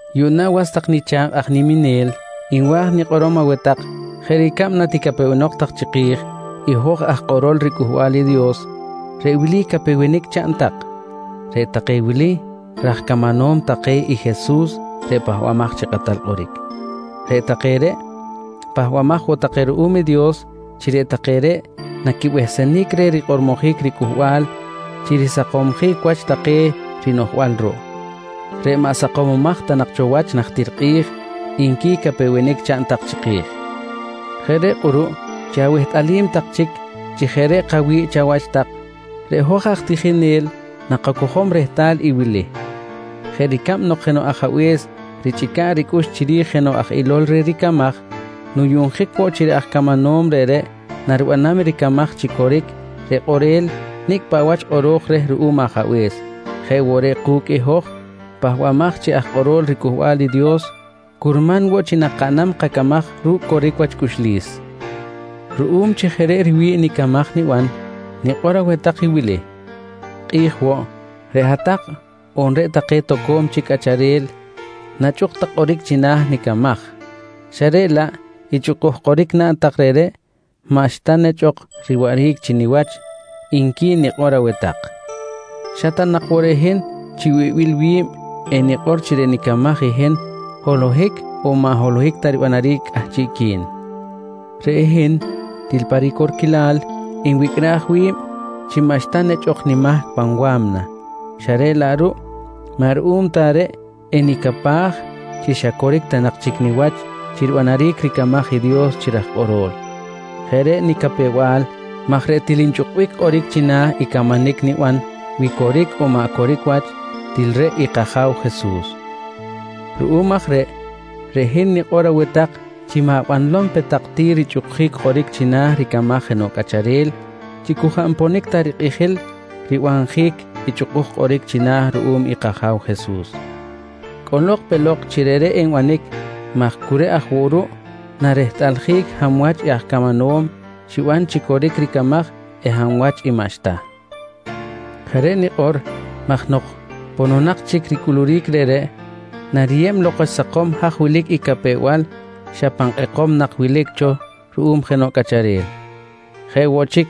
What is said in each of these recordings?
Yuꞌna was tak nicha̱kꞌ aj niminel nwa̱j nikꞌorom aweh tak jeꞌ ricab naticapewenok tak chiki̱j i hoj aj kꞌorol riCꞌuhbal i Dios, reꞌ wili capewenic chaꞌn tak: «Reꞌ take wili raj camanom take i Jesus reꞌ Pahbamaj chi Kꞌatal Kꞌoric. Reꞌ take reꞌ pahbamaj woꞌ take ruꞌum i Dios chi reꞌ take reꞌ naquibehsenic reh rikꞌormojic riCꞌuhbal chi risakomsjic wach take rinoꞌjbal ruꞌ reꞌ maꞌ sakomomaj ta nak cho wach najtir kꞌi̱j, nqui capewenic chaꞌn tak chiki̱j. Jeꞌ reꞌ kꞌuruꞌ chi awehtꞌalim tak chic chi jeꞌ reꞌ kawi̱ꞌ chawach tak, reꞌ hoj aj tijinel nakacojom rehtal i wili: Jeꞌ ricab nok jenoꞌ ajabe̱s richꞌica̱b ricꞌux chiri̱j jenoꞌ aj ilol reh ricamaj nuyuꞌnjic woꞌ chi reꞌ aj camanom reꞌreꞌ naribanam ricamaj chi coric reꞌ kꞌorel nicꞌ paꞌ wach kꞌoro̱j reh ruꞌum ajabe̱s, jeꞌ woꞌ reꞌ ku̱cꞌ i hoj pahbamaj chi aj kꞌorol riCꞌuhbal i Dios, curman woꞌ chi nakaꞌnam kacamaj ru̱cꞌ coric wach cꞌuxlis. Ruꞌum chi jeꞌ reꞌ riwi̱ꞌ nicamaj niban, nikꞌor aweh tak i wili: Kꞌi̱j woꞌ, reꞌ hat-tak on reꞌ take toco̱m chic cꞌacharel nachꞌuk tak kꞌoric china̱ nicamaj xa reꞌ laꞌ i chꞌukuj kꞌoric naꞌn tak reꞌreꞌ xa maꞌxta nechꞌ ok riwaꞌric chi niwach, nqui nikꞌor aweh tak. Xa ta nak woꞌ reꞌ hin chi wibil wi̱b enikꞌor chi reꞌ nicamaj i hin holohic on maꞌ holohic ta ribanaric cꞌahchiꞌqui̱n. Reꞌ hin til pa ricorquilal, nwicꞌraj wi̱b chi maꞌxta nechꞌ ok nimahc pan wa̱mna xa reꞌ laꞌ ruꞌ maꞌ ruꞌum ta reꞌ enicapaj chi xa coric ta nak chic niwach chi ribanaric ricamaj i Dios chi raj kꞌorol. Jeꞌ reꞌ nicapew-bal maj reꞌ til nchꞌukbic kꞌoric china̱ i camanic niban wi coric on maꞌ coric wach, til reꞌ i kAja̱w Jesus. Ruꞌum aj reꞌ, reꞌ hin nikꞌor aweh tak chi ma̱banlom pe tak ti richꞌukjic kꞌoric china̱ ricamaj jenoꞌ cꞌacharel chi cu jaꞌ nponic ta rikꞌijil ribanjic i chꞌukuj kꞌoric china̱ ruꞌum i kAja̱w Jesus. Cꞌolok pe lok chi reꞌreꞌ enbanic maj cu reꞌ aj woꞌ ruꞌ narehtꞌaljic hab wach i aj camanom xiban chi coric ricamaj eh hab wach i maꞌxta. Jeꞌ reꞌ nikꞌor maj nok pononak chic ricꞌuluric reꞌreꞌ, nariyeb lok wach sakom haj wilic i capew-bal xa pan kꞌekom nak wilic cho ruꞌum jenoꞌ cꞌacharel. Jeꞌ woꞌ chic,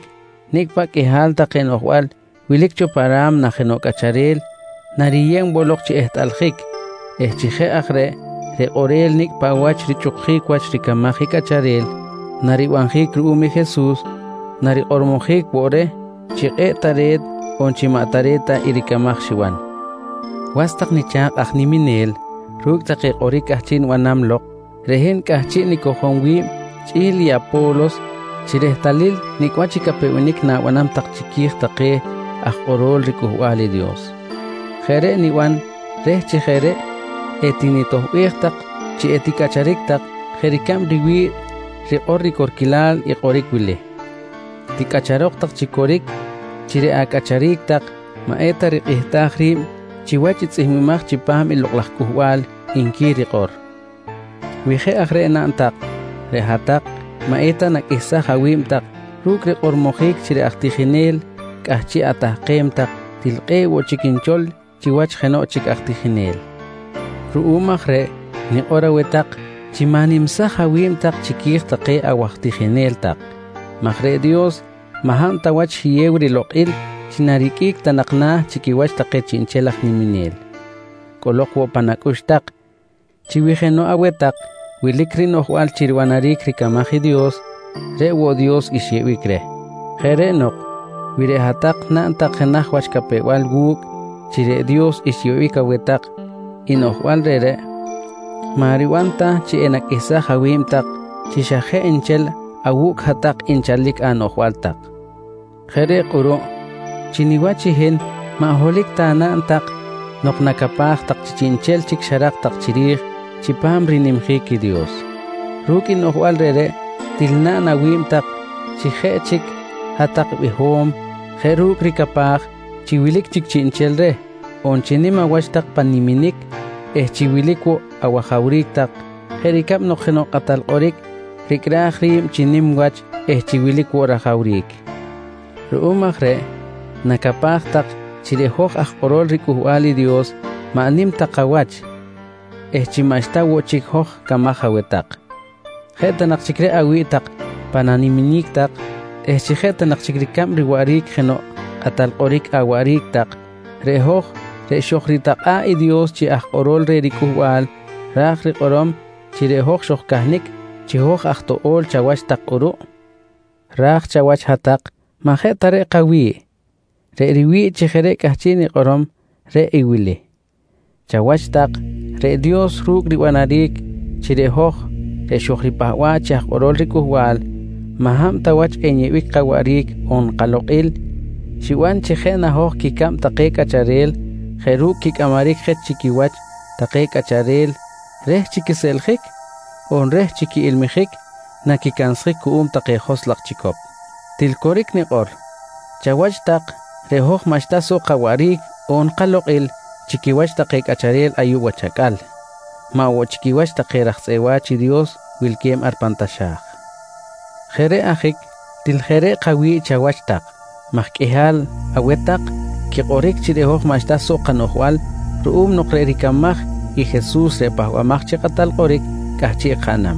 nicꞌ paꞌ qꞌuihal take noꞌjbal wilic cho pa ra̱mna jenoꞌ cꞌacharel nariyeb woꞌ lok chi ehtꞌaljic eh chi jeꞌ aj reꞌ, reꞌ kꞌorel nicꞌ paꞌ wach richꞌukuric wach ricamaj i cꞌacharel naribanjic ruꞌum i Jesus, narikꞌormojic woꞌ reh chi kꞌe̱ꞌ tare̱t on chi maꞌ tare̱t ta i ricamaj xiban. Was tak nicha̱kꞌ aj niminel ru̱cꞌ take kꞌoric cꞌahchiꞌ nibanam lok reꞌ hin cꞌahchiꞌ nicojom wi̱b chꞌi̱l i Apo̱los chi rehtalil nicꞌ wach i capewenic na̱banam tak chiqui̱j take aj kꞌorol riCꞌuhbal i Dios. Jeꞌ reꞌ niban reh chi jeꞌ reꞌ etinitoꞌbej tak chi eticꞌacharic tak jeꞌ ricab riwi̱ꞌ rikꞌor ricorquilal i kꞌoric wili: “Ticꞌacharok tak chi coric chi reꞌ acꞌacharic tak maꞌeta rikꞌihtaj ri̱b chiwach i tzꞌihmbimaj chipam i Lokꞌ laj Cꞌuhbal, nqui rikꞌor. Wi jeꞌ aj reꞌ naꞌn tak, reꞌ hat-tak maꞌ eta naqꞌuihsaj awi̱b tak ru̱cꞌ rikꞌormojic chi reꞌ aj tijinel cꞌahchiꞌ atahkem tak til kꞌe̱ꞌ woꞌ chic nchol chiwach jenoꞌ chic aj tijinel. Ruꞌum aj reꞌ nikꞌor aweh tak chi ma̱nimsaj awi̱b tak chiqui̱j take awaj tijinel tak maj reꞌ Dios maꞌ hab ta wach xiyew rilokꞌil chi nariqꞌuic ta nak na̱ chi quiwach take chiꞌnchel aj niminel. Cꞌolok woꞌ pan acꞌux tak chi wi jenoꞌ aweh tak wilic rinoꞌjbal chi ribanaric ricamaj i Dios, reꞌ woꞌ Dios xyeꞌbic reh. Jeꞌ reꞌ nok wi reꞌ hat-tak naꞌn tak jenaj wach capew-bal wu̱cꞌ chi reꞌ Dios xyeꞌbic aweh tak i noꞌjbal reꞌreꞌ, maꞌ riban ta chi enaqꞌuihsaj awi̱b tak chi xa jeꞌ nchel awu̱cꞌ hat-tak nchalic anoꞌjbal tak. Jeꞌ reꞌ kꞌuruꞌ, chi niwach i hin maꞌ holohic ta naꞌn tak nok nacapaj tak chi chiꞌnchel chic xarak tak chiri̱j chipam rinimjic i Dios. Ru̱cꞌ i noꞌjbal reꞌreꞌ, til naꞌn awi̱b tak chi jeꞌ chic hat-tak biho̱m jeꞌ ru̱cꞌ ricapaj chi wilic chic chiꞌnchel reh, on chi nim awach tak pan niminic eh chi wilic woꞌ awajawric tak jeꞌ ricab nok jenoꞌ kꞌatal kꞌoric ricꞌraj ri̱b chi nim wach eh chi wilic woꞌ rajawric. Ruꞌum aj reꞌ nacapaj tak chi reꞌ hoj aj kꞌorol riCꞌuhbal i Dios maꞌ nim ta kawach eh chi maꞌxta woꞌ chic hoj camaj aweh tak. Jeꞌ ta nak chic reꞌ awi̱ꞌ pan animinic tak eh chi jeꞌ ta nak chic ricab riwaꞌric jenoꞌ aj kꞌatal kꞌoric awaꞌric tak, reꞌ hoj reꞌ xojritakꞌa̱ꞌ i Dios chi aj kꞌorol reh riCꞌuhbal, raj rikꞌorom chi reꞌ hoj xojcahnic chi hoj aj toꞌo̱l chawach tak kꞌuruꞌ! Raj chawach hat-tak maꞌ jeꞌ ta reꞌ kawi̱ꞌ. Reꞌ riwi̱ꞌ chi jeꞌ reꞌ cꞌahchiꞌ nikꞌorom, reꞌ i wili: Chawach tak, reꞌ Dios ru̱cꞌ ribanaric chi reꞌ hoj reꞌ xojripahba̱ꞌ chi aj kꞌorol riCꞌuhbal maꞌ hab ta wach enyeꞌbic kawaꞌric on kalokꞌil, xiban chi jeꞌ na hoj quicab take cꞌacharel jeꞌ ru̱cꞌ quicꞌamaric je chi quiwach take cꞌacharel reh chi quiseꞌljic on reh chi quiꞌilmijic naquicansjic cuꞌum take joskꞌ laj chicop. Til coric nikꞌor, chawach tak reꞌ hoj maꞌxta soꞌ kawaꞌric on kalokꞌil chi quiwach take cꞌacharel ayuꞌ wach acꞌal, maꞌ woꞌ chi quiwach take raj tzꞌeꞌ wa̱ch i Dios wilque̱b ar pan taxa̱j. Jeꞌ reꞌ ajic, til jeꞌ reꞌ kawi̱ꞌ chawach tak maj qꞌuihal aweh tak quikꞌoric chi reꞌ hoj maꞌxta soꞌ kanoꞌjbal ruꞌum nok reꞌ ricamaj i Jesus reꞌ Pahbamaj chi Kꞌatal Kꞌoric cꞌahchiꞌ kaꞌnam.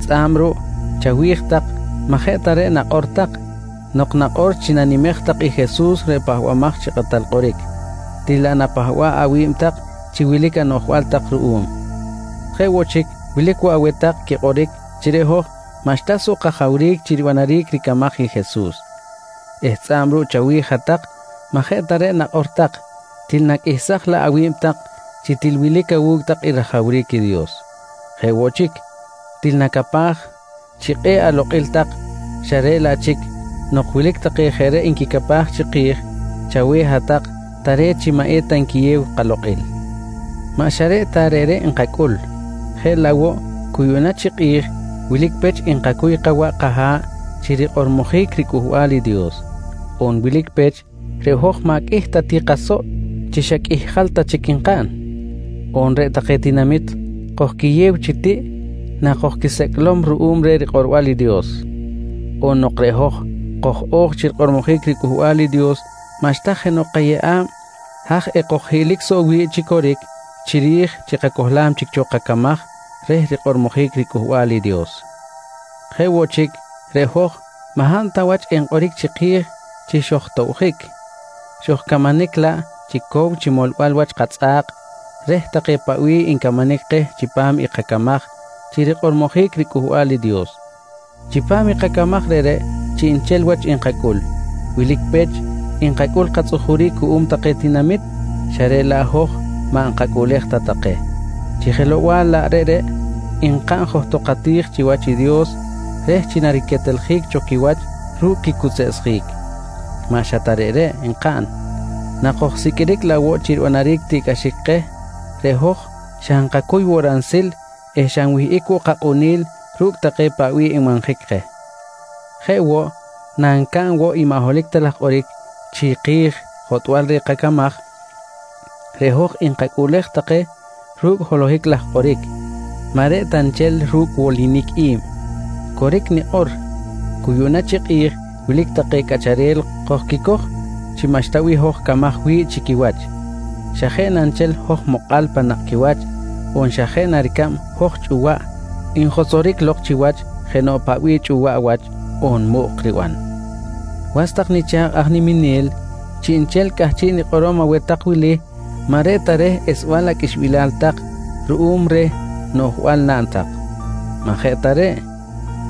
Tzꞌa̱b ruꞌ chawi̱j tak maꞌ jeꞌ ta reꞌ nakꞌor tak nok nakꞌor chi nanimej tak i Jesus reꞌ Pahbamaj chi Kꞌatal Kꞌoric, til laꞌ napahba̱ꞌ awi̱b tak chi wilic anoꞌjbal tak ruꞌum. Jeꞌ woꞌ chic, wilic woꞌ aweh tak quikꞌoric chi reꞌ hoj maꞌxta soꞌ kajawric chi ribanaric ricamaj i Jesus eh tzꞌa̱b ruꞌ chawi̱j hat-tak maꞌ jeꞌ ta reꞌ nakꞌor tak, til naqꞌuihsaj laꞌ awi̱b tak chi til wilic awu̱cꞌ tak i rajawric i Dios. Jeꞌ woꞌ chic, til nacapaj chi kꞌe̱ꞌ alokꞌil tak, xa reꞌ laꞌ chic nok wilic take jeꞌ reꞌ nquicapaj chiki̱j, chaweh hat-tak tare̱t chi maꞌ eta nquiyew kalokꞌil. Maꞌ xa reꞌ ta reꞌreꞌ nkacꞌul, jeꞌ laꞌ woꞌ cu yuꞌna chi kꞌi̱j wilic pech nkacuy kawaꞌ kaha̱ꞌ chi rikꞌormojic riCꞌuhbal i Dios. On wilic pech, reꞌ hoj maꞌ qꞌuih ta woꞌ ti kasoꞌ chi xa qꞌuih jal ta chic nkaꞌn. On reꞌ take tinamit kojquiyew chi tiꞌ na kojquisecꞌlom ruꞌum reh rikꞌorbal i Dios. On nok reꞌ hoj koj-o̱j chi rikꞌormojic riCꞌuhbal i Dios maꞌxta jenoꞌ kayeꞌa̱b haj ekoj-o̱j hiꞌlok soꞌ wi̱ꞌ chi coric chiri̱j chi kacohlam chic cho kacamaj reh rikꞌormojic i riCꞌuhbal i Dios. Jeꞌ woꞌ chic, reꞌ hoj maꞌ hab ta wach enkꞌoric chiki̱j chi xojtoꞌbjic, xojcamanic laꞌ chi cow chi molbal wach katzꞌa̱k reh take paꞌ bih ncamanic keh chipam i kacamaj chi rikꞌormojic riCꞌuhbal i Dios. Chipam i kacamaj reꞌreꞌ chiꞌnchel wach nkacꞌul. Wilic pech nkacꞌul katzꞌujuric cuꞌum take tinamit, xa reꞌ laꞌ hoj maꞌ nkacꞌuꞌlej ta take, chi jelow-bal laꞌ reꞌreꞌ nkaꞌn johtok kati̱j chiwach i Dios reh chi nariqueteljic cho quiwach ru̱cꞌ quicuseꞌsjic. Maꞌ xa ta reꞌreꞌ nkaꞌn, nakojsiqꞌuiric laꞌ woꞌ chi ribanaric tiꞌcꞌaxic keh, reꞌ hoj xa nkacuy woꞌ ransil eh xa nwihꞌic woꞌ kakꞌunil ru̱cꞌ take paꞌ bih nbanjic keh. Jeꞌ woꞌ, nancaꞌn woꞌ maꞌ holohic ta laj kꞌoric chiki̱j jotꞌbal reh kacamaj, reꞌ hoj nkacꞌuꞌlej take ru̱cꞌ holohic laj kꞌoric maꞌ reꞌ ta nchel ru̱cꞌ wolinic i̱b. Coric nikꞌor, cu yuꞌna chi kꞌi̱j wilic take cꞌacharel kojquicoj chi maꞌxta bih hoj camaj wi̱ꞌ chi quiwach xa jeꞌ na nchel hoj mokꞌal pan nakꞌ quiwach on xa jeꞌ na ricab hoj chꞌuwaꞌ njotzoric lok chiwach jenoꞌ paꞌ bih chꞌuwaꞌ wach on muꞌk riban. Was tak nicha̱kꞌ aj niminel, chiꞌnchel cꞌahchiꞌ nikꞌorom aweh tak wili maꞌ reꞌ ta reh esbal aqꞌuixbilal tak ruꞌum reh noꞌjbal naꞌn tak. Maꞌ jeꞌ ta reꞌ,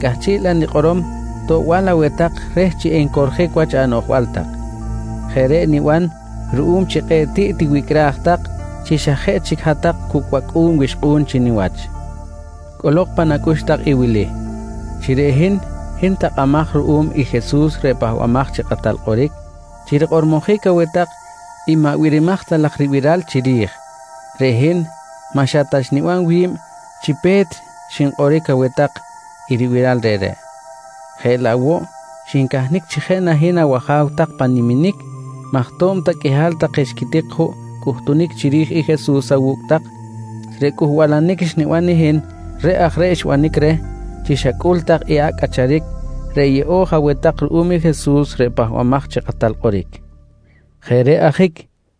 cꞌahchiꞌ laꞌ nikꞌorom toꞌbal aweh tak reh chi encorjic wach anoꞌjbal tak. Jeꞌ reꞌ niban ruꞌum chi kꞌe̱ꞌ tiꞌ tiwicꞌraj tak chi xa jeꞌ chic hat-tak cu̱cꞌ wacꞌu̱n wixkꞌu̱n chi niwach. Cꞌolok pan acꞌux tak i wili: Chi reꞌ hin, hin takꞌamaj ruꞌum i Jesus reꞌ Pahbamaj chi Kꞌatal Kꞌoric chi rikꞌormojic aweh tak i maꞌ birimaj ta laj ribiral chiri̱j, reꞌ hin maꞌ xa ta xniban wi̱b chi pe̱t xinkꞌoric aweh tak i ribiral reꞌreꞌ, jeꞌ laꞌ woꞌ xincahnic chi jeꞌ na hin awaja̱w tak pan animinic maj to̱b ta qꞌuihal take xquitik juꞌ cꞌuhtunic chiri̱j i Jesus awu̱cꞌ tak, reꞌ cꞌuhbalanic xniban i hin reꞌ aj reꞌ xbanic reh chi xacꞌul tak i acꞌ cꞌacharic reꞌ yeꞌo̱j aweh tak ruꞌum i Jesus reꞌ Pahbamaj chi Kꞌatal Kꞌoric. Jeꞌ reꞌ ajic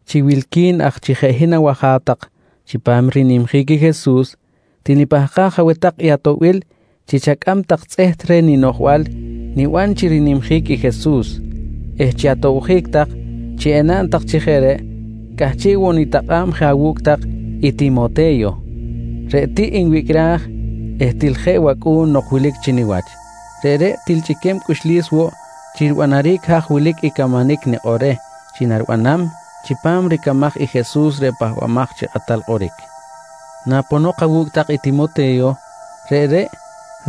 chi wilqui̱n aj chi jeꞌ hin awaja̱w tak chipam rinimjic i Jesus, til nipahkaj aweh tak i atoꞌbil chi chacꞌam tak tzꞌeht reh ninoꞌjbal niban chi rinimjic i Jesus eh chi atobjic tak chi enaꞌn tak chi jeꞌ reꞌ, cꞌahchiꞌ woꞌ nitakꞌa̱b je awu̱cꞌ tak i Timote̱yo reꞌ tiꞌ nwicꞌraj eh til jeꞌ wacꞌu̱n nok wilic chi niwach. Reꞌreꞌ til chꞌiquem cꞌuxlis woꞌ chi ribanaric haj wilic i camanic nikꞌor reh chi nariban chipam ricamaj i Jesus reꞌ Pahbamaj chi Kꞌatal Kꞌoric. Naponok awu̱cꞌ tak i Timote̱yo, reꞌreꞌ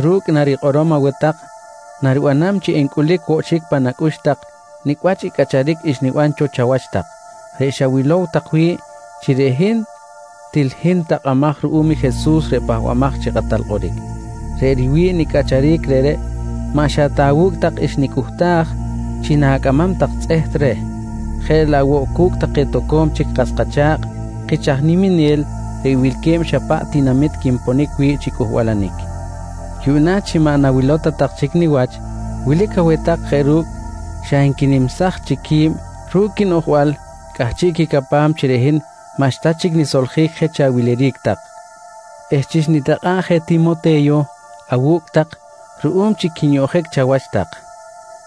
ru̱cꞌ narikꞌorom aweh tak naribanam chi encꞌulic woꞌ chic pan acꞌux tak nicꞌ wach i cꞌacharic xniban cho chawach tak reꞌ xawilow tak wi̱ꞌ chi reꞌ hin til hin takꞌamaj ruꞌum i Jesus reꞌ Pahbamaj chi Kꞌatal Kꞌoric. Reꞌ riwi̱ꞌ nicꞌacharic reꞌreꞌ maꞌ xa ta awu̱cꞌ tak xnicꞌuhtaj chi na̱cꞌamam tak tzꞌeht reh jeꞌ laꞌ woꞌ cu̱cꞌ take toco̱m chic kas kacha̱kꞌ kich aj niminel reꞌ wilque̱b xa paꞌ tinamit quinpon wi̱ꞌ chi cꞌuhbalanic. Yuꞌna chi maꞌ nawilow ta tak chic niwach, wilic aweh tak jeꞌ ru̱cꞌ xa nquinimsaj chic qui̱b ru̱cꞌ quinoꞌjbal cꞌahchiꞌ quicapam chi reꞌ hin maꞌxta chic nisoljic je chi awiliric tak eh chi xnitakꞌa̱ꞌ je Timote̱yo awu̱cꞌ tak ruꞌum chi quinyoꞌjic chawach tak,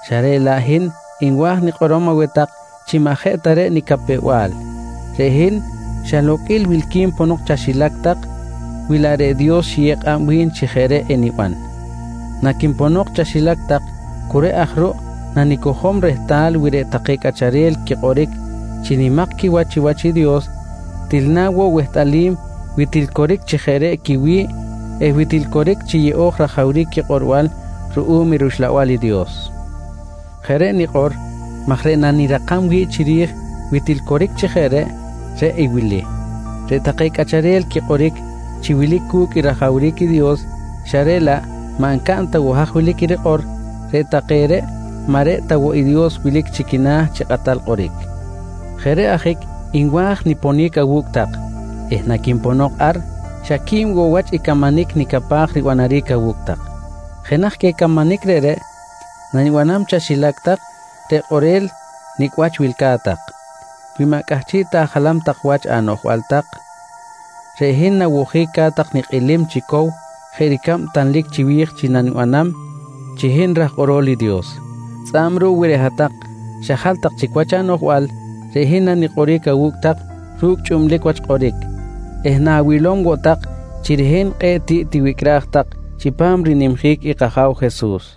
xa reꞌ laꞌ hin nwa̱j nikꞌorom aweh tak chi maꞌ jeꞌ ta reꞌ nicapew-bal. Reꞌ hin xa loqꞌuil wilqui̱n ponok chaxilac tak wi laꞌ reꞌ Dios xiyew kꞌab wi̱n chi jeꞌ reꞌ eniban. Naquinponok chaxilac tak cu reꞌ aj ruꞌ nanicojom rehtal wi reꞌ take cꞌacharel quikꞌoric chi nimak quiwach chiwach i Dios til na woꞌ wehtꞌalim wi til coric chi jeꞌ reꞌ quiwi̱ꞌ eh wi til coric chi yeꞌo̱j rajawric quikꞌorbal ruꞌum i rUxlabal i Dios. Jeꞌ reꞌ nikꞌor maj reꞌ nanirakam wi̱ꞌ chiri̱j wi til coric chi jeꞌ reꞌ, reꞌ i wili: Reꞌ take cꞌacharel quikꞌoric chi wilic cu̱cꞌ i rajawric i Dios xa reꞌ laꞌ maꞌ ncaꞌn ta woꞌ haj wilic i rikꞌor, reꞌ take reꞌ maꞌ reꞌ ta woꞌ i Dios wilic chi quina̱ chi kꞌatal kꞌoric. Jeꞌ reꞌ ajic nwa̱j niponic awu̱cꞌ tak eh naquinponok ar, xa qui̱b woꞌ wach i camanic nicapaj ribanaric awu̱cꞌ tak. Jenaj queh camanic reꞌreꞌ nanibanam chaxilac tak, reꞌ kꞌorel nicꞌ wach wilca̱t tak. Wi maꞌ cꞌahchiꞌ ta ajalam tak wach anoꞌjbal tak, reꞌ hin nawojic ca̱t tak nikꞌilim chi cow jeꞌ ricab tanlic chiwi̱j chi nanibanam chi hin raj kꞌorol i Dios. Tzꞌa̱b ruꞌ wi reꞌ hat-tak xajal tak chic wach anoꞌjbal, reꞌ hin nanikꞌoric awu̱cꞌ tak ru̱cꞌ chꞌublic wach kꞌoric eh nawilom woꞌ tak chi reꞌ hin kꞌe̱ꞌ tiꞌ tiwicꞌraj tak chipam rinimjic i kAja̱w Jesus.